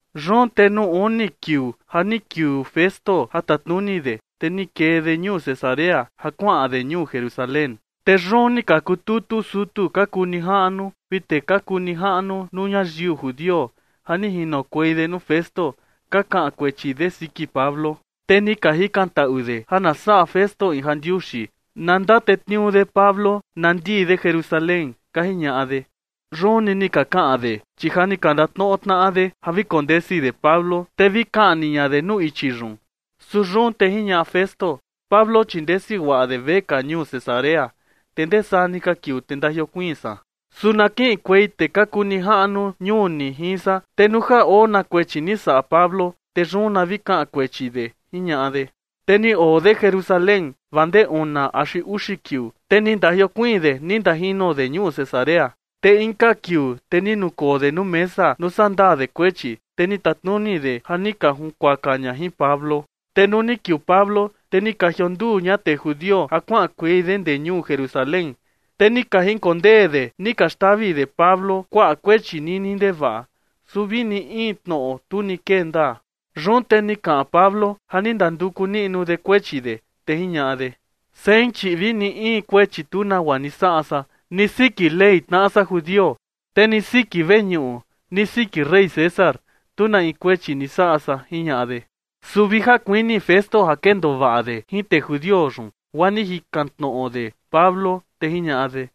Yun te nuu uni kiuu ja ni kiuu Festo ja tatnuni de, te ni kee de ñuu Cesarea ja kuaꞌan de ñuu Jerusalén. Te yun ni ka kututu sutu ka kuu nijaꞌnu vi tee ka kuu ni jaꞌnu nuu ñayiu judio ja ni jinokuei de nuu Festo ka kaꞌan kuechi de siki Pablo. Te ni ka jikantaꞌu de ja na saꞌa Festo in jandiuxi, na ndatetniuu de Pablo na ndii de Jerusalén, ka jiñaꞌa de. Yun ni ni ka kaꞌan de, chi ja ni ka ndatnoꞌo tnaꞌa de ja vi kondesi de Pablo, te vi kaꞌni ña de nuu ichi yun. Su yun te jiñaꞌa Festo: ―Pablo, chi ndesi guaꞌa de vekaa ñuu Cesarea, te ndee saa ni ka kiuu te ndajiokuiin san. Su na kiꞌinkuei tee ka kuu nijaꞌnu ñuu ni jin san, te nuu ja oo na kuechi ni saꞌa Pablo, te yun na vi kaꞌan kuechi de ―jiñaꞌa de. Te ni oo de Jerusalén vaa ndee una axi uxi kiuu, te ni ndajiokuiin de ni ndajino de ñuu Cesarea. Te inka kiuu, te ni nukoo de nuu mesa nuu sandaa de kuechi, te ni tatnuni de ja ni ka junkuaka ña jin Pablo. Te nuu ni kiuu Pablo, te ni ka jionduu ña tee judio ja kuaꞌankuei de ndee ñuu Jerusalén, te ni ka jinkondee de ni ka xtavi de Pablo kuaꞌa kuechi nini ndevaꞌa. Su vini in tnoꞌo, tu ni kee ndaa. Yun te ni kaꞌan Pablo ja ni ndanduku niꞌnu de kuechi de, te jiñaꞌa de: ―Sein, chi vini in kuechi tu nagua ni saꞌa san, ni siki Ley tnaꞌa san judio, te ni siki veñuꞌu, ni siki rey César, tu na in kuechi ni saꞌa san ―jiñaꞌa de. Su vi ja kuini Festo ja kendoo vaꞌa de jin tee judio yun, guaa ni jikan tnoꞌo de Pablo, te jiñaꞌa de: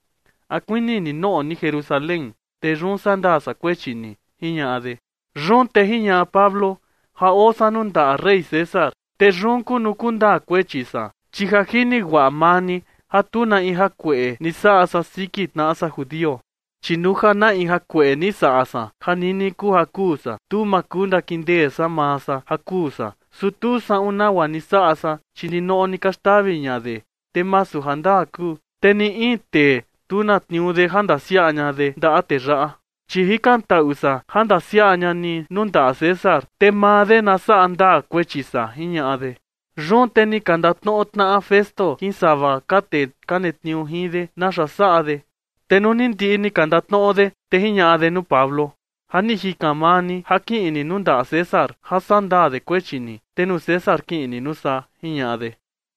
―¿A kuini ni noꞌo ni Jerusalén, te yun sandaa san kuechi ni? ―jiñaꞌa de. Yun te jiñaꞌa Pablo: ―Ja oo san nuu ndaꞌa rey César, te yun kuu nuu kundaa kuechi san, chi ja jini guaꞌa maa ni ja tu na in jakueꞌe ni saꞌa san siki tnaꞌa san judio. Chi nuu ja na in jakueꞌe ni saꞌa san ja nini kuu ja kuu san, tu ma kuu ndakindee san maa san ja kuu san. Su tu saꞌun nagua ni saꞌa san, chi ninoꞌo ni ka xtavi ña de, te masu jandaa kuu. Te ni in tee, tu na tniuu de ja ndasiaꞌa ña de ndaꞌa tee yaꞌa. Chi jikantaꞌu san ja ndasiaꞌa ña ni nuu ndaꞌa César, te maa de na saꞌa ndaa kuechi san ―jiñaꞌa de. Yun te ni ka ndatnoꞌo tnaꞌa Festo jin sava ka tee ka netniuu jin de naxa saꞌa de. Te nuu ni ndiꞌi ni ka ndatnoꞌo de, te jiñaꞌa de nuu Pablo: ―Ja ni jikan maa ni ja kiꞌin ni nuu ndaꞌa César ja saꞌa ndaa de kuechi ni, te nuu César kiꞌin ni nuu saa ―jiñaꞌa de.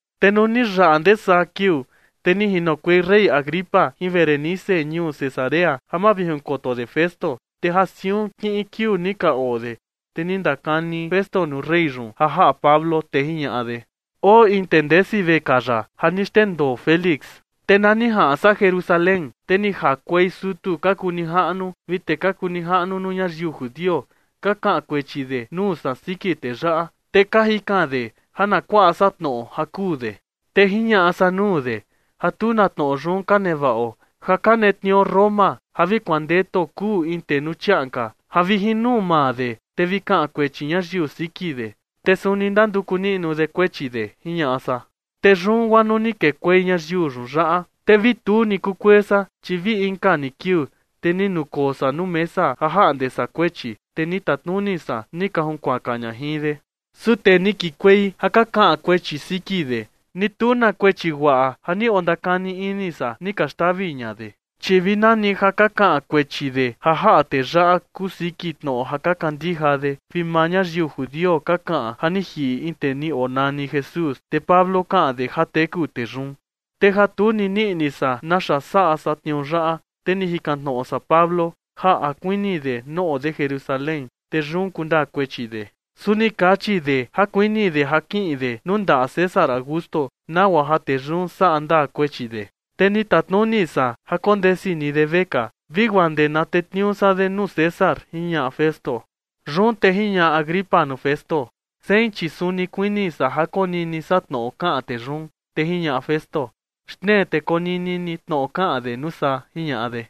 Te nuu ni yaꞌa ndee saa kiuu, te ni jinokuei rey Agripa jin Berenice ñuu Cesarea ja mavijinkoto de Festo. Te ja siun kiꞌin kiuu ni ka oo de, te ni ndakani Festo nuu rey yun ja jaꞌa Pablo, te jiñaꞌa de: ―Oo in tee ndesi vekaa yaꞌa ja ni xndendoo Félix. Te na ni jaꞌan san Jerusalén, te ni jakuei sutu ka kuu nijaꞌnu vi tee ka kuu nijaꞌnu nuu ñayiu judio ka kaꞌan kuechi de nuu san siki tee yaꞌa, te ka jikan de ja na kuaꞌa san tnoꞌo ja kuu de. Te jiñaꞌa san nuu de ja tu na tnoꞌo yun ka nevaꞌo ja ka netniuu Roma ja vi kuandetuo kuu in tee nuu chiaꞌan ka ja vi jin nuu maa de, te vi kaꞌan kuechi ñayiu siki de, te suni ndanduku niꞌnu de kuechi de, jiñaꞌa san. Te yun guaa nuu ni kekuei ñayiu yun yaꞌa, te vi tu ni kukuee san, chi vi inka ni kiuu, te ni nukoo san nuu mesa ja jaꞌnde san kuechi, te ni tatnuni san ni ka junkuaka ña jin de. Su tee ni kikuei ja ka kaꞌan kuechi siki de, ni tu na kuechi guaꞌa ja ni ondakani ini san ni ka xtavi ña de. Chi vi nani ja ka kaꞌan kuechi de ja jaꞌa tee yaꞌa kuu siki tnoꞌo ja ka kandija de, vi maa ñayiu judio ka kaꞌan ja ni jiꞌi in tee ni onani Jesús, te Pablo kaꞌan de ja teku tee yun. Te ja tu ni nii ini san naxa saꞌa san tniuu yaꞌa, te ni jikan tnoꞌo san Pablo ja a kuini de noꞌo de Jerusalén, te yun kundaa kuechi de. Su ni kachi de ja kuini de ja kiꞌin de nuu ndaꞌa César Augusto, nagua ja tee yun saꞌa ndaa kuechi de. Te ni tatnuni san ja kondesi ni de vekaa vi guaa ndee na tetniuu san de nuu César ―jiñaꞌa Festo. Yun te jiñaꞌa Agripa nuu Festo: ―Sein, chi suni kuini san ja konini san tnoꞌo kaꞌan tee yun. Te jiñaꞌa Festo: ―Xtnee te konini ni tnoꞌo kaꞌan de nuu saa ―jiñaꞌa de.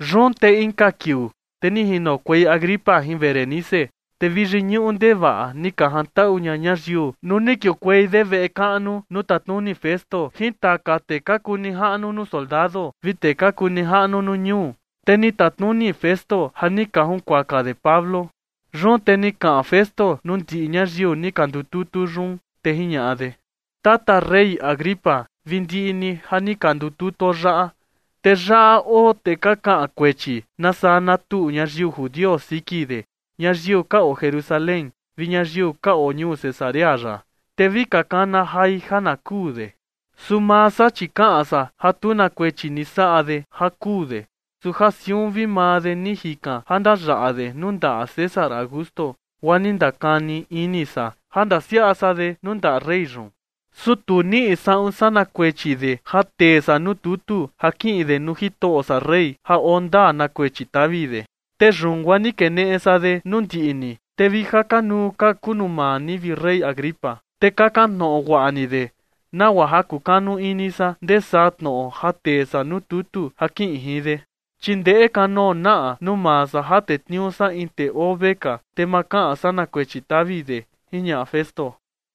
Yun te inka kiuu, te ni jinokuei Agripa jin Berenice, te vi yiñuꞌu ndevaꞌa ni ka jantaꞌu ña ñayiu nuu ni kiukuei de veꞌe kaꞌnu nuu tatnuni Festo jin taka tee ka kuu nijaꞌnu nuu soldado vi tee ka kuu nijaꞌnu nuu ñuu, te ni tatnuni Festo ja ni ka junkuaka de Pablo. Yun te ni kaꞌan Festo nuu ndiꞌi ñayiu ni ka ndututu yun, te jiñaꞌa de: ―Tata Rey Agripa vi ndiꞌi ni ja ni ka ndututuo yaꞌa, te yaꞌa oo tee ka kaꞌan kuechi na saa na tuꞌu ñayiu judio siki de, ñayiu ka oo Jerusalén vi ñayiu ka oo ñuu Cesarea yaꞌa, te vi ka kana jai ja na kuu de. Su maa san, chi kaꞌan san ja tu na kuechi ni saꞌa de ja kuu de. Su ja siun vi maa de ni jikan ja ndayaꞌa de nuu ndaꞌa César Augusto, guaa ni ndakani ini san ja ndasiaꞌa san de nuu ndaꞌa rey yun. Su tu niꞌi saꞌun san na kuechi de ja tee san nuu tutu ja kiꞌin de nuu jitoꞌo san rey ja oo ndaa na kuechi tavi de. Te yun guaa ni keneꞌe san de nuu ndiꞌi ni, te vi ja kanuu ka kuu nuu maa ni, vi rey Agripa, te kakan tnoꞌo guaꞌa ni de, nagua ja kukanu ini san ndee saa tnoꞌo ja tee san nuu tutu ja kiꞌin jin de. Chi ndeꞌe kanoo naꞌa nuu maa san ja tetniuu san in tee oo vekaa, te ma kaꞌan san na kuechi tavi de ―jiñaꞌa Festo.